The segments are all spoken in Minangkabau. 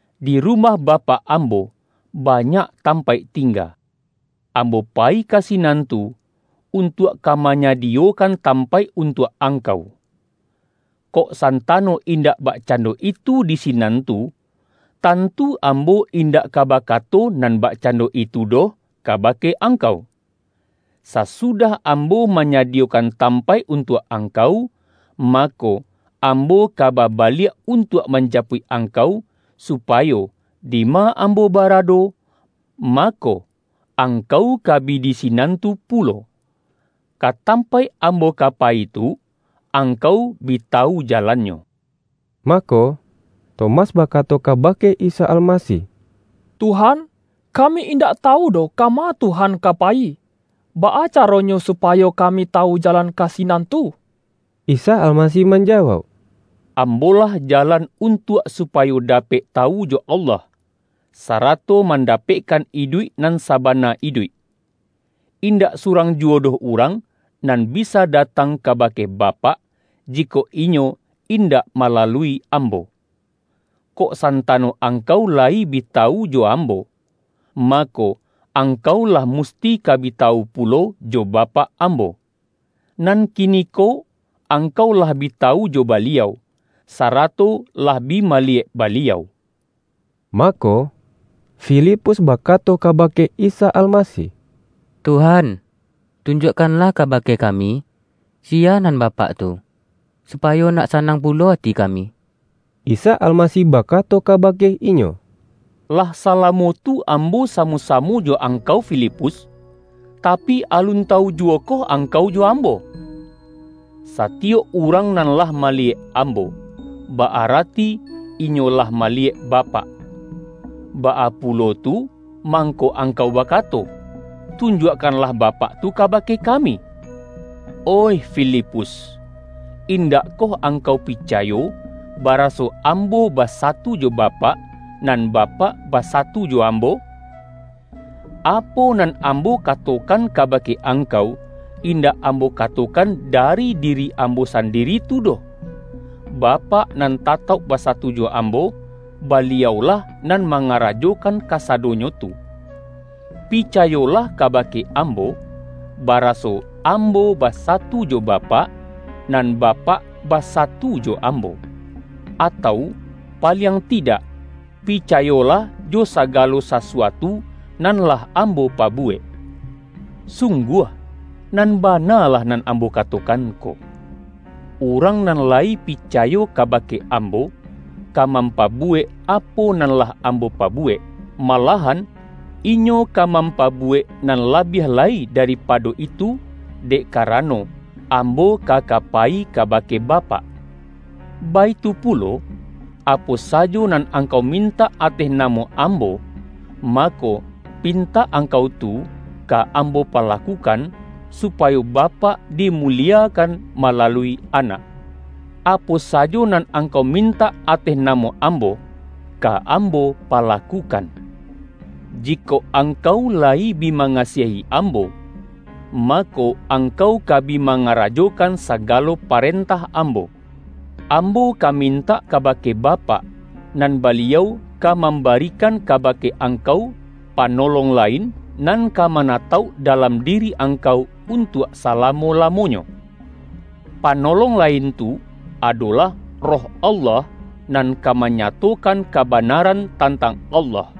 Di rumah Bapak Ambo, banyak tampaik tingga. Ambo payi ka sinan tu, untuak ka ma-nyadiyokan tampaik untuak angkau. Kok santano indak bakcando itu di sinan tu, tantu Ambo indak ka baka-to nan bakcando itu doh kabake ang-kau. Sasudah Ambo manyadiyokan tampaik untuak angkau, mako, Ambo ka babaliak untuak manjapuik ang-kau, supayo, dima Ambo barado, mako, angkau ka bi di sinan tu pulo. Ka tampaik Ambo ka payi tu, ang-kau bi tawu jalannyo.” Mako, Tomas bakato kabake Isa Almasih,”Tuhan, kami indak tawu doh kama Tuhan ka payi, baa caronyo supa-yo kami tawu jalan ka sinan tuh?” Isa Almasih manjawauk,”Ambo-lah jalan untuak supayo dapek tawu jo Allah, sarato mandapekkan iduik nan sabana iduik. Indak surang juwo doh urang nan bisa datang kabake Ba-pak, jikok inyo indak malalui Ambo. Kok santano angkau layi bi tawu jo Ambo, mako, angkau lah musti ka bi tawu pulo jo Bapak Ambo. Nan kini-ko angkau lah bi tawu jo Baliau, sa-rato lah bi maliyek Baliau.” Mako, Filipus bakato kabake Isa Almasih,”Tuhan, tunjuakkanlah ka-bake kami, siya nan Bapak tu, supa-yo nak sanang pulo ati kami.” Isa Almasih bakato kabake inyo,”Lah salamo tu Ambo samo-samo jo angkau Filipus, tapi, alun tawu juwo-koh angkau jo Ambo? Satiyok urang nan lah maliyek Ambo, ba-arati inyo lah maliyek Bapak. Baa pulo tu, mang-ko angkau bakato, ’Tunjuakkanlah Ba-pak tu kabake kami'? Oih Filipus! Indakkoh angkau picayo, baraso Am-bo basatu jo Bapak, nan Bapak basa-tu jo Ambo? Apo nan Ambo katokan kabake angkau, indak Ambo katokan dari diri Ambo sandiri tu doh. Bapak nan tatauk basatu jo Ambo, Baliau-lah nan mangarajokan kasadonyo tu. Picayolah kabake Ambo, baraso Am-bo basatu jo Bapak, nan Bapak basatu jo Ambo. Atau paliang tidak, picayolah jo sagalo sasuatu nan lah Ambo pabuwek. Sungguah, nan bana lah nan Ambo katokan ko: Urang nan layi pi-cayo kabake Ambo, ka mampabuwek apo nan lah Ambo pabuwek, malah-an inyo ka mampabuwek nan labiah lai daripado itu dek karano, Ambo ka ka payi kabake Bapak. Baitu pu-lo, apo sajo nan angkau mintak ateh namo Ambo, mako, pintak angkau tu ka Ambo palakukan, supayo Bapak di-muliekan malalui Anak. Apo sajo nan angkau mintak ateh namo Ambo, ka Ambo palakukan.” ”Jikok angkau layi bi mangasiahi Ambo, mako, angkau ka bi mangara-jokan sagalo parentah Ambo. Ambo ka mintak kabake Bapak, nan Baliau ka mambarikan kabake angkau Pa-nolong lain, nan ka manatauk dalam diri angkau untuak salamo-lamonyo. Panolong lain tu, adolah Roh Allah, nan ka manyatokan kabanaran tantang Allah.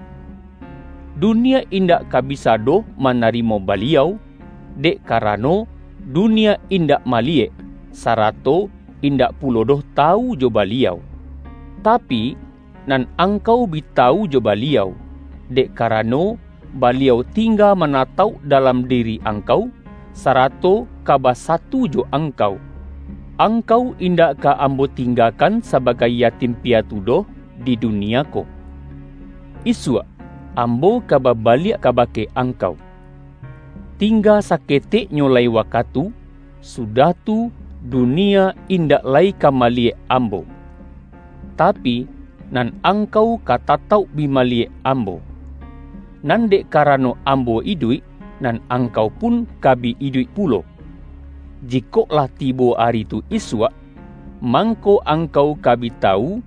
Dunia indak ka bisa doh mana-rimo Baliau, dek karano, dunia indak maliyek, sarato indak pulo doh tawu jo Baliau. Tapi, nan angkau bi tawu jo Baliau, dek karano, Baliau tingga manatauk dalam diri angkau, sarato ka basatu jo angkau. Angkau indak ka Ambo tingga-kan sabagai yatim piatu doh di du-nia ko. Isuak, Ambo ka babaliak ka-bake angkau. Tingga saketeknyo lai wakatu, sudah tu, dunia indak lai ka maliyek Ambo. Tapi, nan angkau ka tatauk bi maliyek Ambo. Nan dek ka-rano Ambo iduik, nan angkau pun ka bi iduik pulo. Jikok lah tibo ari tu isuak, mangko, angkau ka bi tawu,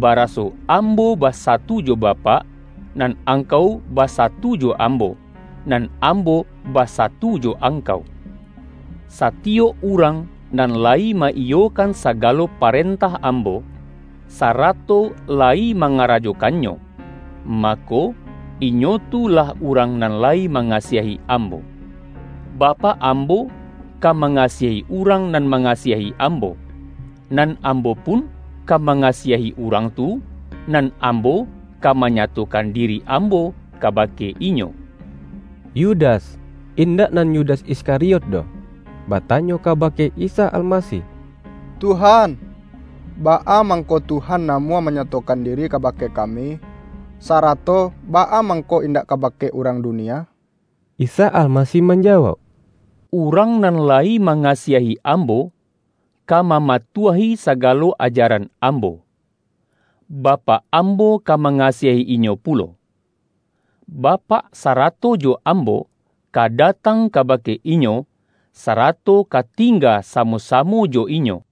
ba-raso Ambo basatu jo Bapak, nan ang-kau basatu jo Ambo, nan Ambo basa-tu jo angkau. Satiyok urang nan layi ma-iyo-kan sagalo parentah Ambo, sarato layi mangarajokannyo, mako, inyo tu lah urang nan layi mangasiahi Ambo. Ba-pak Ambo ka mangasiahi urang nan mangasiahi Ambo. Nan Ambo pun ka mangasiahi urang tu, nan Ambo ka ma-nyatokan diri Ambo kabake inyo.” Yudas (indak nan Yudas Iskari-ot doh,) batanyo kabake Isa Almasih,”Tuhan, baa mangko Tuhan namuah manyatokan diri kabake kami, sara-to baa mangko indak kabake urang dunia?” Isa Almasih manjawauk,”Urang nan layi mangasiahi Ambo, ka mama-tuahi sagalo ajaran Ambo. Bapak Ambo ka mangasiahi inyo pulo. Bapak sara-to jo Ambo, ka datang kabake inyo, sarato ka tingga samo-samo jo inyo.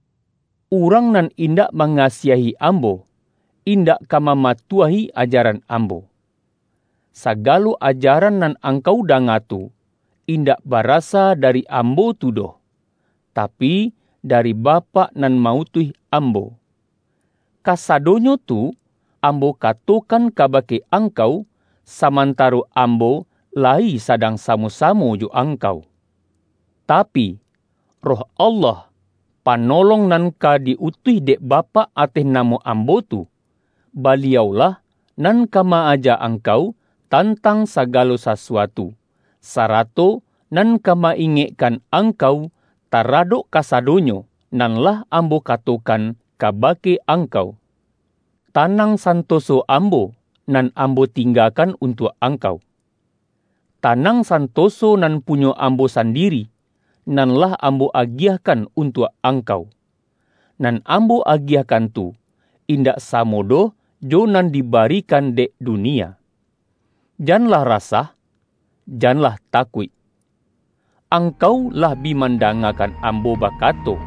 Urang nan indak mangasiahi Am-bo, indak ka mamatuahi ajaran Ambo. Sagalo ajaran nan angkau danga tu, indak barasa dari Ambo tu doh, tapi, dari Bapak nan ma-utuih Ambo. Kasadonyo tu Ambo katokan ka-bake angkau, samantaro Ambo layi sadang samo-samo jo angkau. Tapi, Roh Allah, Panolong nan ka di-utuih dek Bapak ateh namo Ambo tu, Baliau-lah nan ka ma-aja angkau tantang sa-galo sasuatu, sarato nan ka ma-ingek-kan angkau taradok kasadonyo nan lah Ambo katokan kabake angkau. Tanang santoso Ambo, nan Ambo tinggakan untuak angkau. Tanang san-toso nan punyo Ambo sandiri, nan lah Ambo agiahkan untuak angkau. Nan Ambo agiahkan tu indak samo doh jo nan dibarikan dek dunia. Janlah ra-sah, janlah takuik. Angkau lah bi mandangakan Ambo bakato,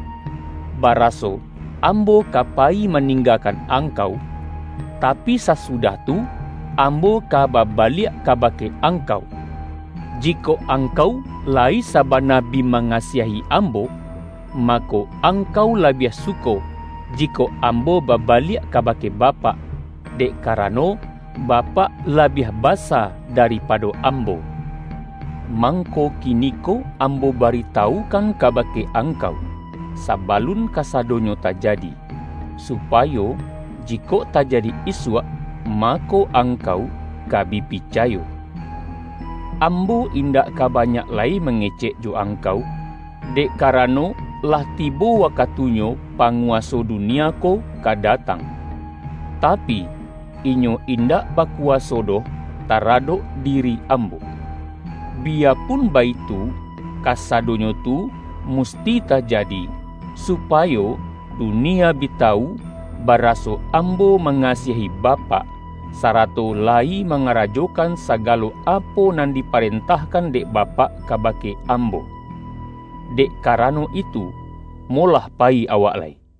’Baraso Ambo ka payi maninggakan angkau, tapi sasudah tu Ambo ka babaliak ka-bake angkau'. Jikok angkau layi saba-na bi mangasiahi Ambo, mako angkau labiah suko, jikok Ambo babaliak ka-bake Bapak, dek karano Bapak labiah basa daripado Ambo. Mangko kini-ko Ambo baritawukan kabake angkau, sabalun kasadonyo tajadi, supayo ji-kok tajadi isuak, mako angkau ka bi picayo. Ambo indak ka banyak lai mangecek jo angkau, dek karano, lah tibo wakatunyo panguwaso dunia ko ka datang. Tapi, inyo indak bakuwa-so doh taradok diri Ambo. Biyapun baitu, kasadonyo tu musti tajadi, su-payo dunia bi tawu, baraso Ambo ma-ngasiahi Bapak, sarato layi mangara-jokan sagalo apo nan diparentahkan dek Bapak kabake Ambo. Dek karano itu, molah payi awak lai.” YAHYA